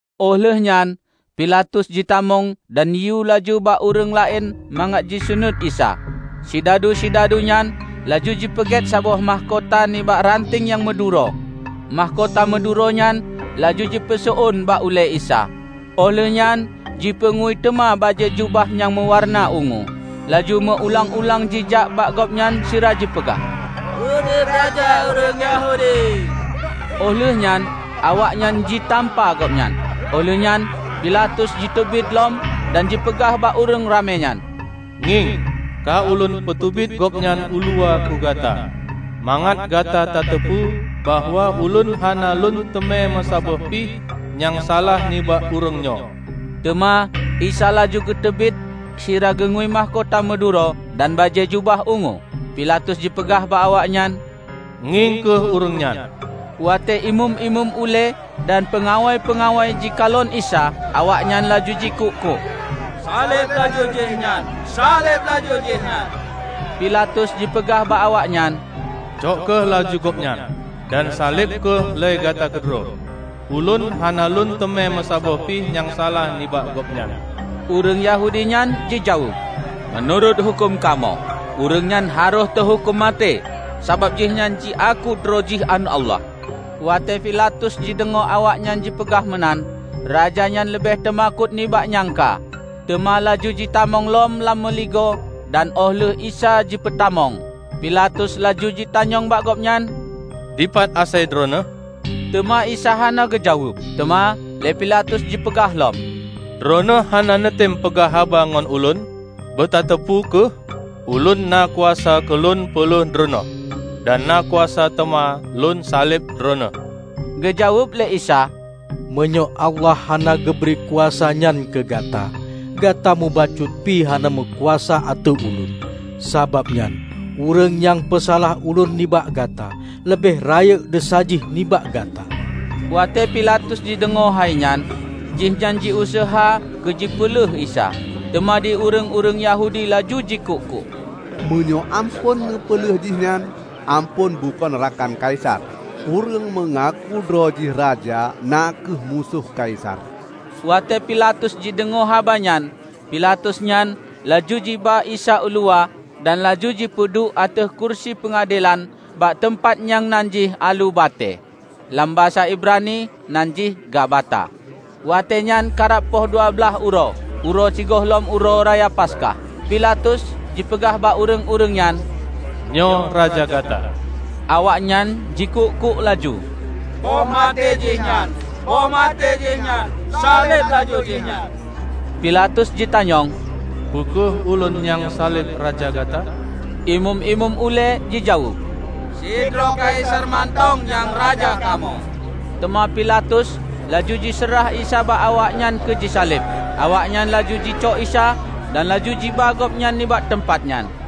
Óh lheuehnyan Pilatus jitamong dan jiyue laju bak ureuëng laén mangat jiseunuét Isa. Sidadu-sidadu nyan laju jipeugét saboh mahkota nibak ranteng nyang meuduro, mahkota meuduro nyan laju jipeuseuôn bak ulée Isa. Óh lheueh nyan jipeungui teuma bajée jubah nyang meuwareuna ungu, laju meu-ulang-ulang jijak bak Gobnyan sira jipeugah, "Udeb raja ureuëng Yahudi!" Óh lheuehnyan awaknyan jitampa Gobnyan. Óh lheueh nyan Pilatus jiteubiet lom dan jipeugah bak ureuëng ramé nyan, "Ngieng! Ka ulôn peuteubiet Gobnyan uluwa keu gata, mangat gata tateupeue bahwa ulôn hana lôn teumé meusaboh pi nyang salah nibak ureuëng nyoe." Teuma Isa laju geuteubiet sira geungui mahkota meuduro dan bajée jubah ungu. Pilatus jipeugah bak awaknyan, "Ngieng kheueh ureuëng nyan." Watée imeum-imeum ulée dan peungawai-peungawai jikalon Isa, awaknyan laju jikuk-kuk, "Saleb laju Jihnyan, saleb laju Jihnyan!" Pilatus jipeugah bak awaknyan, "Cok kheueh laju Gobnyan, dan saleb kheueh lé gata keudroe, ulôn hana lôn teumé meusaboh pi nyang salah nibak Gobnyan." Ureuëng Yahudi nyan jijaweueb, "Meunurot huköm kamoe, ureuëng nyan harôh teuhuköm maté sabab Jihnyan jiaku droe jih Aneuëk Allah." Watée Pilatus jideungoe awaknyan jipeugah meunan, raja nyan leubeh teumakot nibak nyang ka. Teuma laju jitamong lom lam meuligoe dan óh lheueh Isa jipeutamong, Pilatus laju jitanyong bak Gobnyan, "Dipat asai droeneueh?" Teuma Isa hana geujaweueb. Teuma lé Pilatus jipeugah lom, "Droeneueh hana neutem peugah haba ngon ulôn? Beutateupeue kheueh, ulôn na kuasa keu lôn peulheueh Droeneueh, dan na kuasa teuma lôn saleb Droeneueh!" Geujaweueb lé Isa, "Meunyoe Allah hana geubri kuasa nyan keu gata, gata mubacut pi hana meukuasa ateueh Ulôn. Sabab nyan, ureuëng nyang peusalah Ulôn nibak gata, leubeh rayeuk desya jih nibak gata." Watée Pilatus jideungoe hai nyan, jihnyan jiuseuha keu jipeuleueh Isa. Teuma di ureuëng-ureuëng Yahudi laju jikuk-kuk, "Meunyoe amphon neupeuleueh Jihnyan, amphon bukon rakan Kaisar! Ureuëng meungaku droejih raja na kheueh musoh Kaisar!" Watée Pilatus jideungoe haba nyan, Pilatus nyan laju jiba Isa uluwa dan laju jipeuduek ateueh kurusi peungadelan bak teumpat nyang nan jih Aleue Batée. (Lam basa Ibrani nan jih Gabata.) Watéenyan karab poh dua blaih uroe, uroe sigohlom Uroe Raya Paskah. Pilatus jipeugah bak ureuëng-ureuëng nyan, "Nyoe raja gata!" Awaknyan jikuk-kuk laju, "Poh maté Jihnyan! Poh maté Jihnyan! Saleb laju jihnyan!" Pilatus jitanyong, "Peu kheueh ulôn nyang saleb raja gata?" Imeum-imeum ulée jijaweueb, "Sidroe Kaisar mantong nyang raja kamoe!" Teuma Pilatus laju jiseurah Isa bak awaknyan keu jisaleb. Awaknyan laju jicok Isa, dan laju jiba Gobnyan nibak teumpat nyan.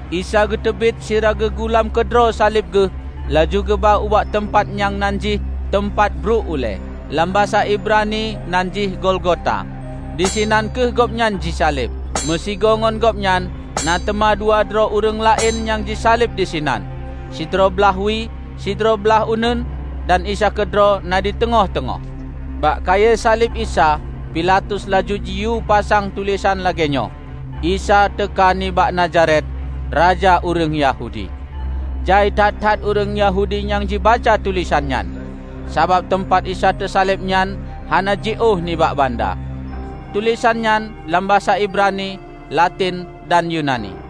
Isa geuteubiet sira geugulam keudroe saleb Geuh laju geuba ubak teumpat nyang nan jih, "Teumpat Bruek Ulée". (Lam basa Ibrani nan jih Golgota.) Disinan kheueh Gobnyan jisaleb. Meusigoe ngon Gobnyan na teuma dua droe ureuëng laén nyang jisaleb disinan; sidroe blaih wie, sidroe blaih uneuen dan Isa keudroe na di teungoh-teungoh. Bak kayée saleb Isa, Pilatus laju jiyue pasang tulésan lagée nyoe, "Isa teuka nibak Nazaret, Raja Ureuëng Yahudi". Jai that-that ureuëng Yahudi nyang jibaca tulésan nyan, sabab teumpat Isa teusaleb nyan hana jiôh nibak banda. Tulésan nyan lam basa Ibrani, Laten dan Yunani.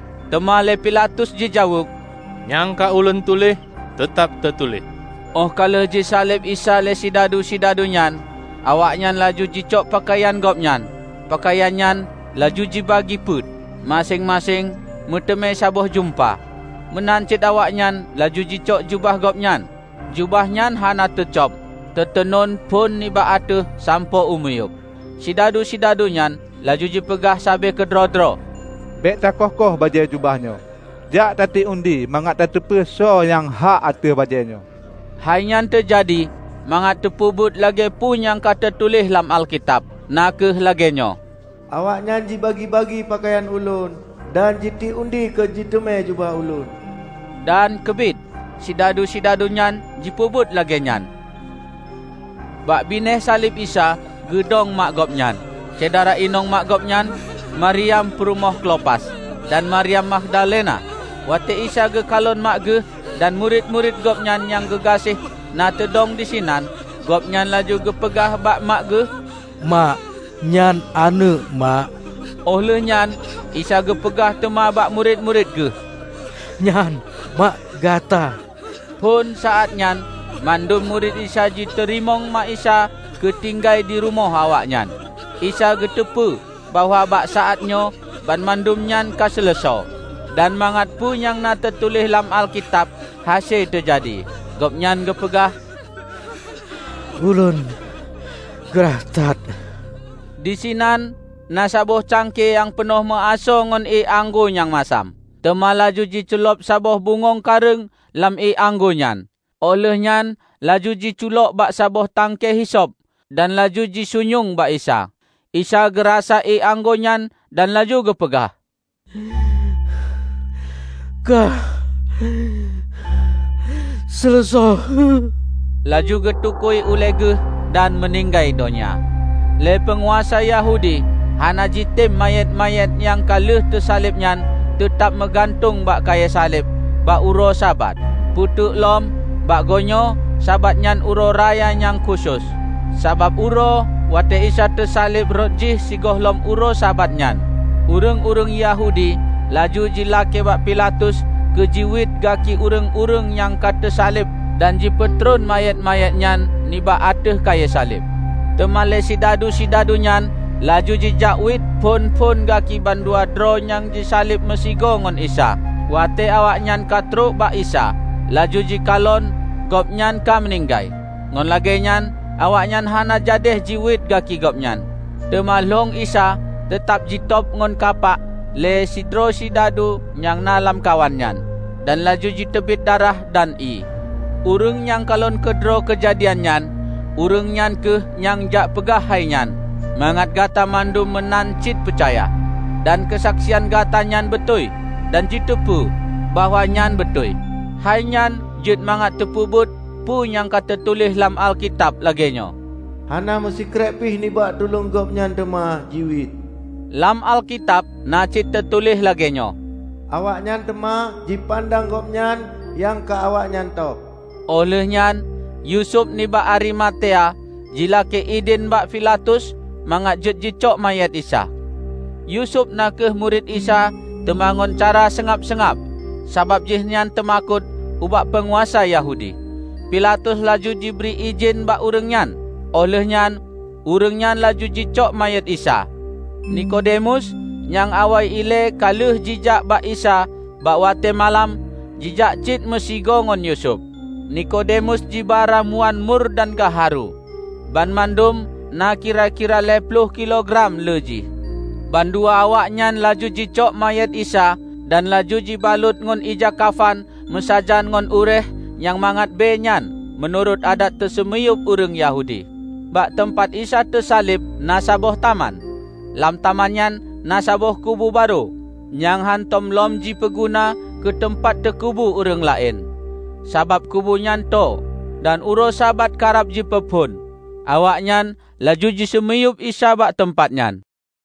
Teuma lé Pilatus jijaweueb, "Nyang ka ulôn tuléh, teutab teutuléh." Óh ka lheueh jisaleb Isa lé sidadu-sidadu nyan, awaknyan laju jicok peukayan Gobnyan. Peukayan nyan laju jibagi peuet: maséng-maséng meuteumé saboh jeumba. Meunan cit awaknyan laju jicok jubah Gobnyan. Jubah nyan hana teucôb -- teutenun phon nibak ateueh sampoe u miyueb. Sidadu-sidadu nyan laju jipeugah sabe keudroe-droe, "Bék ta koh-koh bajée jubah nyoe. Jak tatiek undi mangat tateupeue soe nyang hak ateueh bajée nyoe." Hainyan teujadi mangat teupeubuet lagée peue nyang ka teutuléh lam Alkitab, na kheueh lagée nyoe: "Awaknyan jibagi-bagi peukayan Ulôn, dan jitiek undi keu jiteumé jubah Ulôn." Dan keubiet sidadu-sidadu nyan jipeubuet lagée nyan. Bak binéh saleb Isa geudong mak Gobnyan, syedara inong mak Gobnyan, Maryam peurumoh Klopas, dan Maryam Magdalena. Watée Isa geukalon mak Geuh dan murit-murit Gobnyan nyang geugaséh na teudong disinan, Gobnyan laju geupeugah bak mak Geuh, "Mak, nyan aneuëk mak." Óh lheueh nyan Isa geupeugah teuma bak murit-murit Geuh, "Nyan mak gata." Phon saát nyan mandum murit Isa jiteurimong mak Isa keu tinggai dirumoh awaknyan. Isa geuteupeue bahwa bak saátnyoe banmandum nyan ka seuleusoe, dan mangat peue nyang na teutuléh lam Alkitab hase teujadi, Gobnyan geupeugah, "Ulôn glah that." Disinan na saboh cangkie nyang peunoh meuasoe ngon ié anggô nyang masam. Teuma laju jiculob saboh bungöng kareueng lam ié anggô nyan, óh lheueh nyan laju jiculok bak saboh tangke hisop, dan laju jisunyueng bak Isa. Isa geurasa ié anggô nyan dan laju geupeugah, "Ka seuleusoe!" Laju geutukui ulée Geuh dan meuninggai donya. Lé peunguasa Yahudi hana jitem manyét-manyét nyang ka lheueh teusaleb nyan teutab meugantung bak kayée saleb bak uroe Sabat, peue teuklom bak goenyoe Sabat nyan Uroe Raya nyang khusos. Sabab uroe watée Isa teusaleb rhot jih sigohlom uroe Sabat nyan, ureuëng-ureuëng Yahudi laju jilakée bak Pilatus keu jiwiet gaki ureuëng-ureuëng nyang ka teusaleb dan jipeutron manyét-manyét nyan nibak ateueh kayée saleb. Teuma lé sidadu-sidadu nyan laju jijak wiet phon-phon gaki bandua droe nyang jisaleb meusigoe ngon Isa. Watée awaknyan ka trok bak Isa, laju jikalon Gobnyan ka meuninggai. Ngon lagée nyan awaknyan hana jadéh jiwiet gaki Gobnyan. Teuma lhong Isa teutab jitôb ngon kapak lé sidroe sidadu nyang na lamkawan nyan; dan laju jiteubiet darah dan ié. Ureuëng nyang kalon keudroe keujadian nyan, ureuëng nyan kheueh nyang jak peugah hainyan, mangat gata mandum meunan cit peucaya. Dan keusaksian gata nyan beutôi, dan jiteupeue bahwa nyan beutôi. Hainyan jeuet mangat teupeubuet peue nyang ka teutuléh lam Alkitab lagée nyoe: "Hana meusikrek pih nibak tuleueng Gobnyan teuma jiwiet". Lam Alkitab na cit teutuléh lagée nyoe, "Awaknyan teuma jipandang Gobnyan nyang ka awaknyan tôb". Óh lheueh nyan Yusuf nibak Arimatea jilakée idhin bak Pilatus mangat jeuet jicok manyét Isa. (Yusuf na kheueh murit Isa teuma ngon cara seungab-seungab, sabab jihnyan teumakot ubak peunguasa Yahudi.) Pilatus laju jibri idhin bak ureuëng nyan, óh lheueh nyan ureuëng nyan laju jijakcok manyét Isa. Nekodemus, nyang awai ilée ka lheueh jijak bak Isa bak watée malam, jijak cit meusigoe ngon Yusuf. Nekodemus jiba ramuan mur dan gaharu -- banmandum na kira-kira lhée ploh kilo gram le jih. Bandua awaknyan laju jicok manyét Isa dan laju jibalot ngon ija kafan meusajan ngon uréeh nyang mangat bée nyan meunurot adat teuseumiyueb ureuëng Yahudi. Bak teumpat Isa teusaleb na saboh taman. Lam taman nyan na saboh kubu barô, nyang hántom lom jipeuguna keu teumpat teukubu ureuëng laén. sabab kubu nyan tô, dan uroe Sabat karab jipeuphon, awaknyan laju jiseumiyueb Isa bak teumpat nyan.